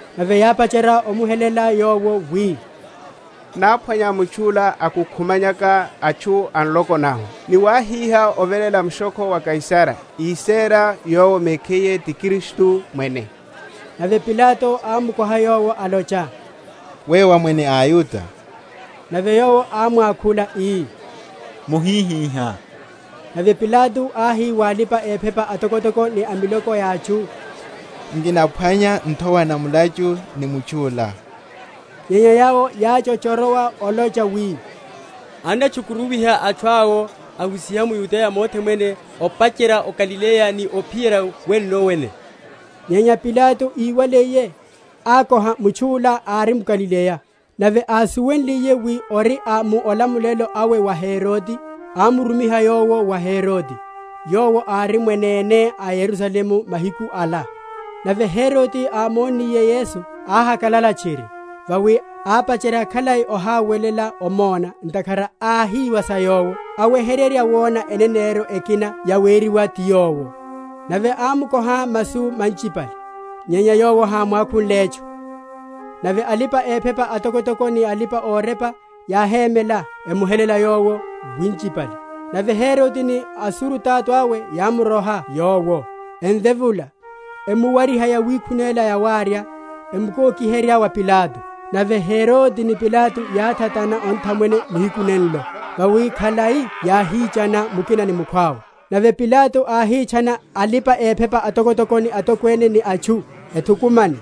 Nave yápacherya omuhelela Yowo, wi, Náphwanya mutchu’la akukhumanyaka atchu a nloko nahu, ni wáhiha oveléla mushokho wa Kaisara, ísera Yowo mekhiye ti Kristu mwene. Nave Pilato ámukoha Yowo, alocha, Weyo wá mwene a aYuda? Nave Yowo ámwakhula ii, Mohihihá. Nave Pilato áhi wa alipa‐ephepa atokotoko ni miloko ya atchu, Nkinaphwanya nthowa na mulachu ni mutchu’la. Nyenya yawo yáchochorowa olocha wi, Annatchukuruwiha atchu awo, ahusiha m’Yudeya mothe mwene, opacherya o Galileya ni ophiyerya winno wene. Nyenya Pilato íwaliye, ákoha mutchu’la ári mGalileya. Nave ásuwenliye wi ori a mu olamulelo awe wa Herode, ámurumiha Yowo wa Herode, yowo ári mwanene o Yerusalemu mahiku ala. Nave Herode, ámonniye Yesu, áhakalala tchiri; vawi ápacherya khalai ohawela omona, ntakhara áhiwa sa Yowo; aweheryerya wona eneneryo ekina yaweriwa ti Yowo. Nave ámukoha masu manchipale; nyenya Yowo hámwakhunle etchu. Nave alipa‐ephepa atokotoko ni alipa‐orepa yáhémela emuhelela Yowo winchipale. Nave Herode ni asurutato awe yámuroha Yowo, emvevula, emuwariha yawikhunela yawarya, emukokiherya wa Pilato. Nave Herode ni Pilato yáthatana onthamwene nihiku nenlo: vawi khalai yáhichana mukina ni mukhwawe. Nave Pilato áhitchana alipa‐ephepa atokotoko ni atokwene, ni atchu, ethukumane,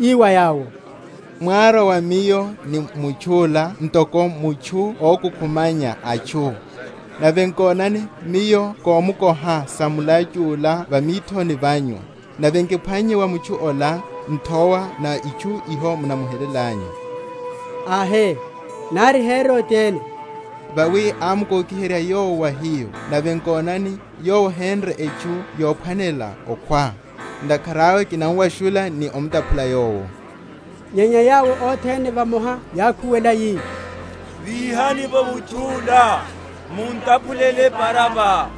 ii wa yawo, Mwárwa wa miyo ni mutchu’la ntoko mutchu ókukhumanya atchu: nave nkonani, miyo kámukoha sa mulachu’la va mithoni vanyu, nave nkiphwannye va mutchu’la nthowa na itchu iho munamuhelelanyu: ahe, nari Herode ene; vawi ámukokiherya Yowo wa hiyo; nave nkonani, Yowo henre etchu yophwanela okhwa. Ntakhara awe kinamuwashula ni omutaphula Yowo. Nyenya yawo othene vamoha yákhuwela, yi, Víhani’vo mutchu’la, mun’taphulele Baraba: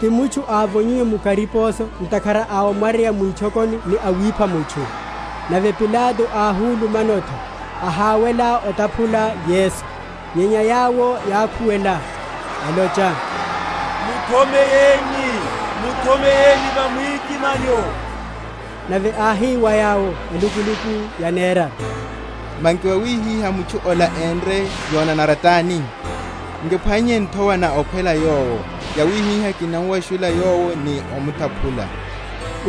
ti mutchu ávonyiwe mu kariposo ntakhara a omwaryeya mwitchokoni ni awipha mutchu. Nave Pilato áhulumano’tho, ahawela otaphula Yesu; nyenya yawo yákhuwela, elocha, Muthomeyeni, muthomeyeni va mwikimanyo. Nave áhi wa yawo elukuluku yaneraru, Manki vawihihá mutchu’la enre yonanara tani? Nkiphwannye nthowa na okhwela Yowo; yawihihá kinamuwashula Yowo ni omutaphula.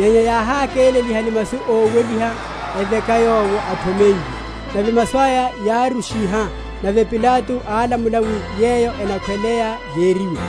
Nyenya yáhákeleliha ni masu óweliha, eveka Yowo athomeyiwe. Nave masu aya yárushiha. Nave Pilato álamulela wi yeyo enakhwelaya yeriwe.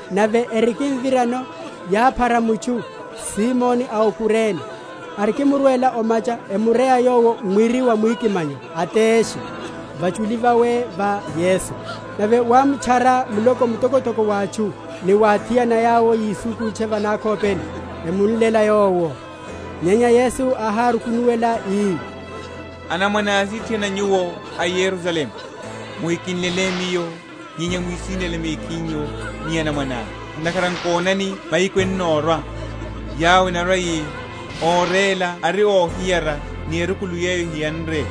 Nave erikimvirano, yáphara mutchu Simoni a o Kurene, arikimurwela o’macha emureya yowo mwiri wa mwikimanyo ateshe vachuli vawe va Yesu. Nave wámutchara muloko mtokotoko wa atchu, ni wa athiana yawo yisukutcha va nakhopeni, emunlela Yowo. Nyenya Yesu áhárukunuwela ii, Anamwane asithiana nyuwo a Yerusalemu, muhikinlele Miyo, nyenya mwisinlele mekhinyu ni anamwananyu. Ntakhara nkonani mahiku ennorwa, yawo enarwa‐yi, Óréla ari óhiyara ni erukulu yeyo ehiyanre,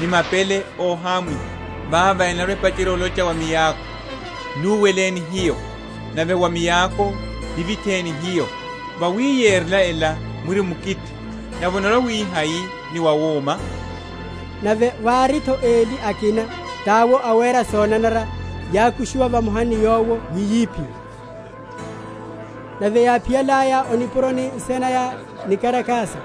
ni mapele óhamwiha. Vavo enarwa‐epacherya olocha wa miako, Nuweleni hiyo; nave wa mioko, Nivitheni hiyo. Vawi yerela ela mwiri mukithi, nave onarwa‐wihai ni wawúma? Nave wári’tho eli akina, tawo awera sonanara, yákushiwa vamoha ni Yowo wi yiphiwe. Yesu va mwikimanyo. Nave yáphiyalaya o nipuroni nsina naya, Níkarakasa,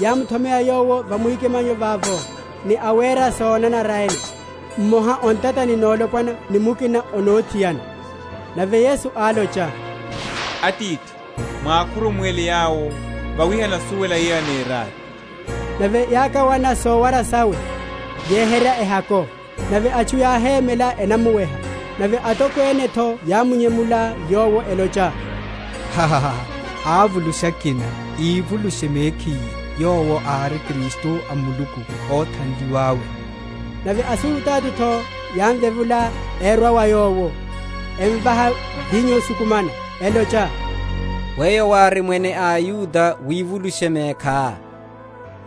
yámuthomeya Yowo va mwikimanyo vavo, ni awera sonanara ene, mmoha o ntatani nolopwana ni mukina o nothiana. Nave Yesu álocha, Atithi, mwakhurumuwele yawo, vawi henasuwela yeyo eneraya. Nave yákawana sowara sawe, yeheryerya ehako. Nave atchu yáhémela enamuweha. Nave atokwene’tho yámunyemula Yowo, elocha, Ávulusha akina; ivulushe mekhiye, Yowo ári Kristu a Muluku, óthanliwa’we. Nave asurutato’tho yámvevula, erwa wa Yowo, emvaha vinyo ósukumana, elocha, Weyo wári mwene a aYuda, wivulushe mekhá.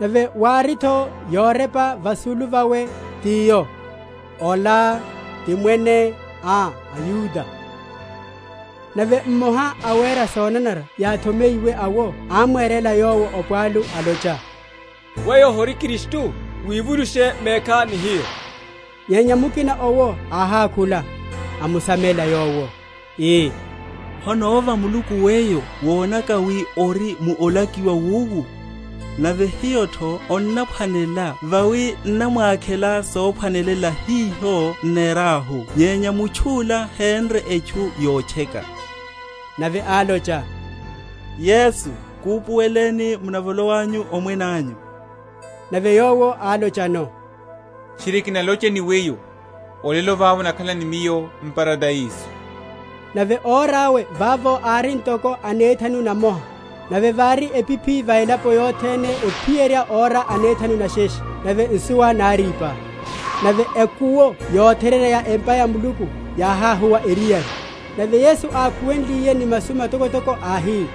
Nave wári’tho yorepa vasulu vawe, tiyo: Ola ti Mwene a aYuda. Nave mmoha a awera sonanara yáthomeyiwe awo ámwerela Yowo opwalu alocha, Weyo hori Kristu? wivulushe mekhá ni hiyo. Nyenya mukina owo áhákhula, amusamela yowo, ii, Honova Muluku weyo, wonaka wi ori mu olakiwa wowu? Nave hiyo’tho onnaphwanela; vawi n’namwakhela sophwanela hiho nenrahu: nyenya mutchu’la henre etchu yotcheka. Nave álocha, Yesu, kupuweleni munavolowanyu Omwene anyu. Nave Yowo álochano, Tchiri, kinalocha ni weyo, Olelo vava onakhala ni Miyo m’Paradaiso. Nave ora awe vavo ári ntoko anethanu namoha. Nave vári epiphi va elaponi vothene ophiyerya ora anethanu nesheshe, nave nsuwa nárípa. Nave ekuwo yotherya ya empa ya Muluku yáhahuwa eriyari. Nave Yesu ákhuwenliye ni masu matokotoko, áhi,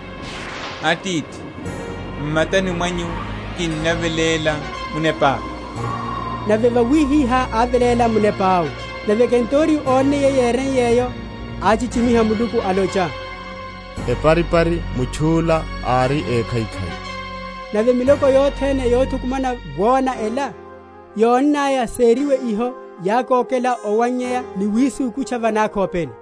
Atithi, m’matani mwanyu kinaveléla munepa’ka. Nave vawihihá áveléla munepa’we. Nave kenturiyo ónniye yeriwe’yo, áchichimiha Muluku, alocha, Eparipari mutchu’la ári ékhaikhai. Nave miloko yothene yothukumana wona ela, yonnaya seriwe iho, yákokela owannyaya ni wisukutcha va nakhopeni.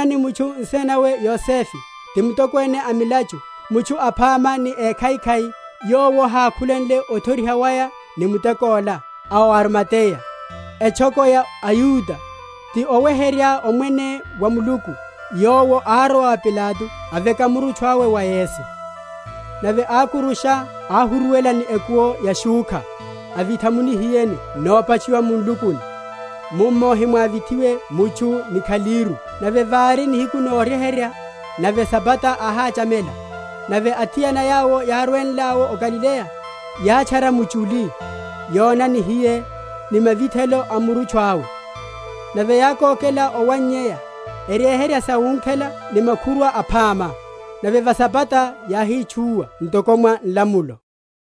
Nave nkonani, mutchu nsina nawe Yosefe, ti mtokwene a milachu, mutchu aphama ni ékhaikhai (yowo hákhulenle othoriha waya ni muteko’la) a o Arimateya, etchoko ya aYuda, ti óweherya Omwene wa Muluku, yowo árowa wa Pilato aveka murutchu awe wa Yesu. Nave ákurusha, ahuruwela ni ekuwo ya shúkha, avitha mu nihiyeni nopatchiwa mu nlukuni, mummo hemwávithiwe mutchu ni khalíru. Nave vári nihiku noryeherya, nave Sabata áhachamela. Nave athiana yawo yárwenleno o Galileya, yátchara muchuli, yona nihiye, ni mavithelo a murutchu awe. Nave yákokela owannyaya, eryeherya sawunkhela ni makhurwa aphama. Nave va Sabata yáhitchúwa ntoko mwa nlamulo.